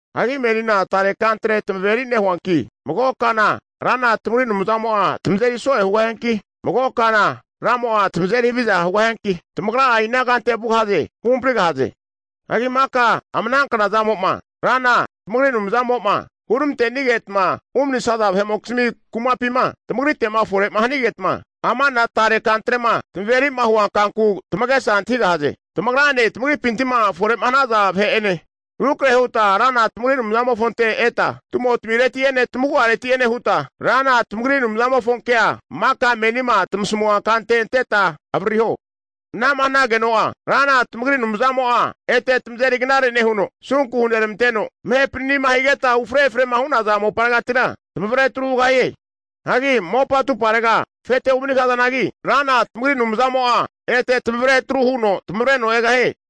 Hagi menina tare kantre tamaveri nehuanki, mago kana Rana tamagri Anumzamo'a tamazeri so'e hugahianki, mago kana Ramo'a tamazeri haviza hugahianki, tamagra'a inankante vugahaze huhamprigahaze. Hagi maka ama ana knazamo'ma Rana tamagri Anumzamo'ma huramante'nigetma umanisaza vahe'mokizmi kumapima tamagrite'ma fore'ma hanigetma, amana tare kantrema tamaveri'ma huankanku tamagesa antahigahaze. Tamagrane tamagripinti'ma fore hanaza vahe'ene rukrahe huta Rana tamagri Anumzamofonte eta, tumotimireti'ene tamagu'areti'ene huta Rana tamagri Anumzamofonkea maka menima tamasamua kante anteta avaririho. Ana'ma hanageno'a, Rana tamagri Anumzamo'a ete tamazeri knare nehuno, asunku huneramanteno, tamahe panani'ma higetama ufre efrema hu'naza moparegatira tamavre atru hugahie. Hagi mopa atumparega afete umanigahazanagi, Rana tamagri Anumzamo'a ete tamavre atruhuno tamavreno egahie.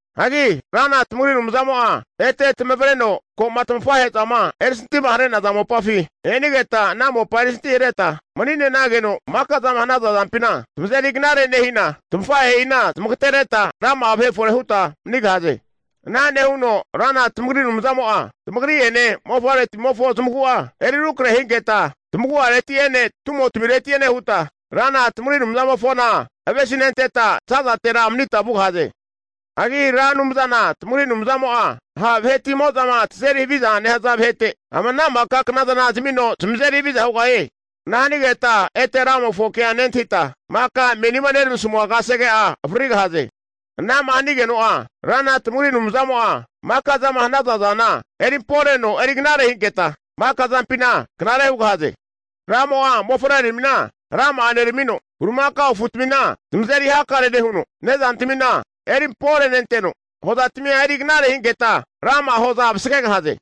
Hagi Rana tamagri Anumzamo'a ete tamavreno ko'ma tamafahe'zama erisantima hare'naza mopafi enigetama ana mopa erisintihareta mani'ne'nageno maka'zama hanaza zampina, tamazeri knare nehina tamafahe'ina zamagatereta rama'a vahe fore huta manigahaze. Ana nehuno Rana tamagri Anumzamo'a tamagri'ene mofavretimimofo zamagu'a eri rukrahehinketa tamagu'areti'ene tumotamireti'ene huta, Rana tamagri Anumzamofona avesinenteta za'zatera manita vugahaze. Hagi Ra Anumzana tamagri Anumzamo'a ha' vahetimo'zama tazeri havizama nehaza vahete ama ana maka knazana zamino zamazeri haviza hugahie. Ana hanigeta ete Ramofo kea nentahita, maka menima neramasamua kasege'a avaririgahaze. Ana'ma hanageno'a Rana tamagri Anumzamo'a maka zama hanaza zana erimporeno eri knare hinketa, maka zampina knare hugahaze. Ramo'a mofavreramina rama'a neramamino, bulimakao afutamina zamazeri hakare nehuno, nezantamina erimporenenteno, hozatamia eri knare hinketa rama'a hoza vasagegahaze.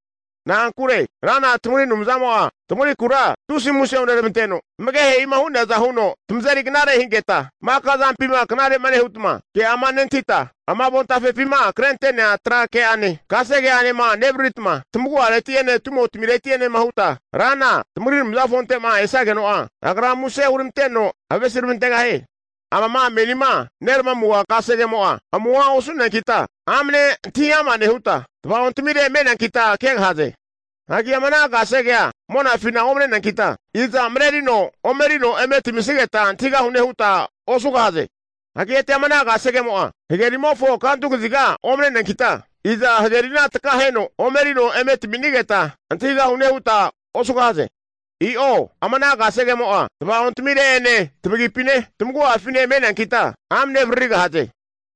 Na'ankure Rana tamagri Anumzamo'a tamagrikura tusi muse huneramanteno, tamagehe'ima hu'neaza huno tamazeri knare hinketa, maka zampima knare nehutma, ke'ama nentahita, ama avontafepima krente'nea tra ke'ane kasege'anena nevariritma, tamagu'areti'ene tumotmi'areti'enema hutma Rana tamagri Anumzamofonte'ma esageno'a, Agra muse huramanteno avesiramantegahie. Amama menima neramamua kasegemo'a amuhoa osu'nenkita amane antahi ama nehuta, tavaontamire me'neankita kegahaze. Hagi ama ana kasegea monafina omneneankita, iza marerino omerino eme tamisigeta antahigahune huta osugahaze. Hagi ete ama ana kasegemo'a hagerimofo kantu kaziga omne'neankita, iza hagerina takaheno omerino eme tami'nigeta antahigahune huta osugahaze. I'o, ama ana kasegemo'a tava'ontmire'ene tamagipine, tamagu'afine me'neankita amane avaririgahaze.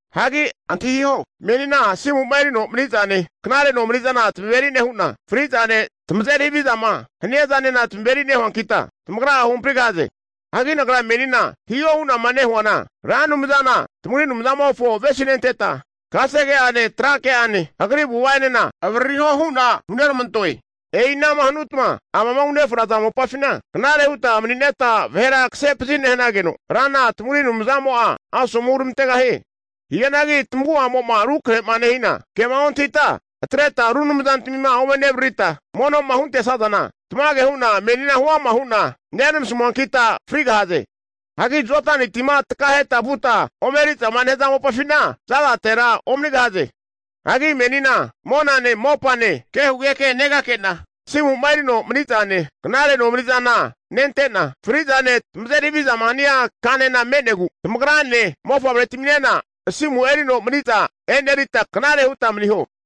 Hagi antahiho, menina asimu'ma erino mani'zane, knare nomani'zana tamaveri nehu'na, fri'zane tamazeri havizama hania zanena tamaveri nehuankitma tamagra'a huhamprigahaze. Hagi nagra menima hiho hu'nama nehuana, Ra Anumzana tamagri Anumzamofo avesinenteta kasege'ane, tra ke'ane Agri avu'ava'ene avaririho hu'na huneramantoe. E'i anama hanutma amama unefraza mopafina knare huta mani'neta vahera kasepazi nehanageno, Rana tamagri Anumzamo'a asomu huramantegahie. Hianagi tamagu'amo'ma rukarahe'ma nehina, kema ontahita atreta ru anumzantamima ome nevaririta mono'ma huntesazana, tamage hu'na menina huama hu'na neramasamuankita frigahaze. Hagi Jodani tima takaheta vuta ome eri'zama nehaza mopafina za'zatera omanigahaze. Hagi menina monane mopane kehugeke negake'na, asimu'ma erino mani'zane knare nomani'zana nente'na, fri'zane tamazeri havizama hania kanena me'negu tamagrane mofavretiminena asimu erino mani'za e'nerita knare huta maniho.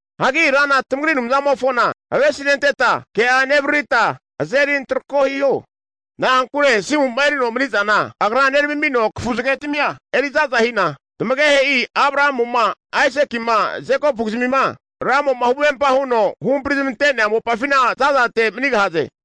Hagi Rana tamagri Anumzamofona avesinenteta, ke'a nevaririta azeri antarako hiho. Na'ankure asimu'ma erino mani'zana Agra neramamino kafu zagetimia eri za'za hina tamagehe'i, Abrahamuma, Aisaki'ma Jekopukizmima Ramo'ma huvempa huno huhampri zamante'nea mopafina zazate manigahaze.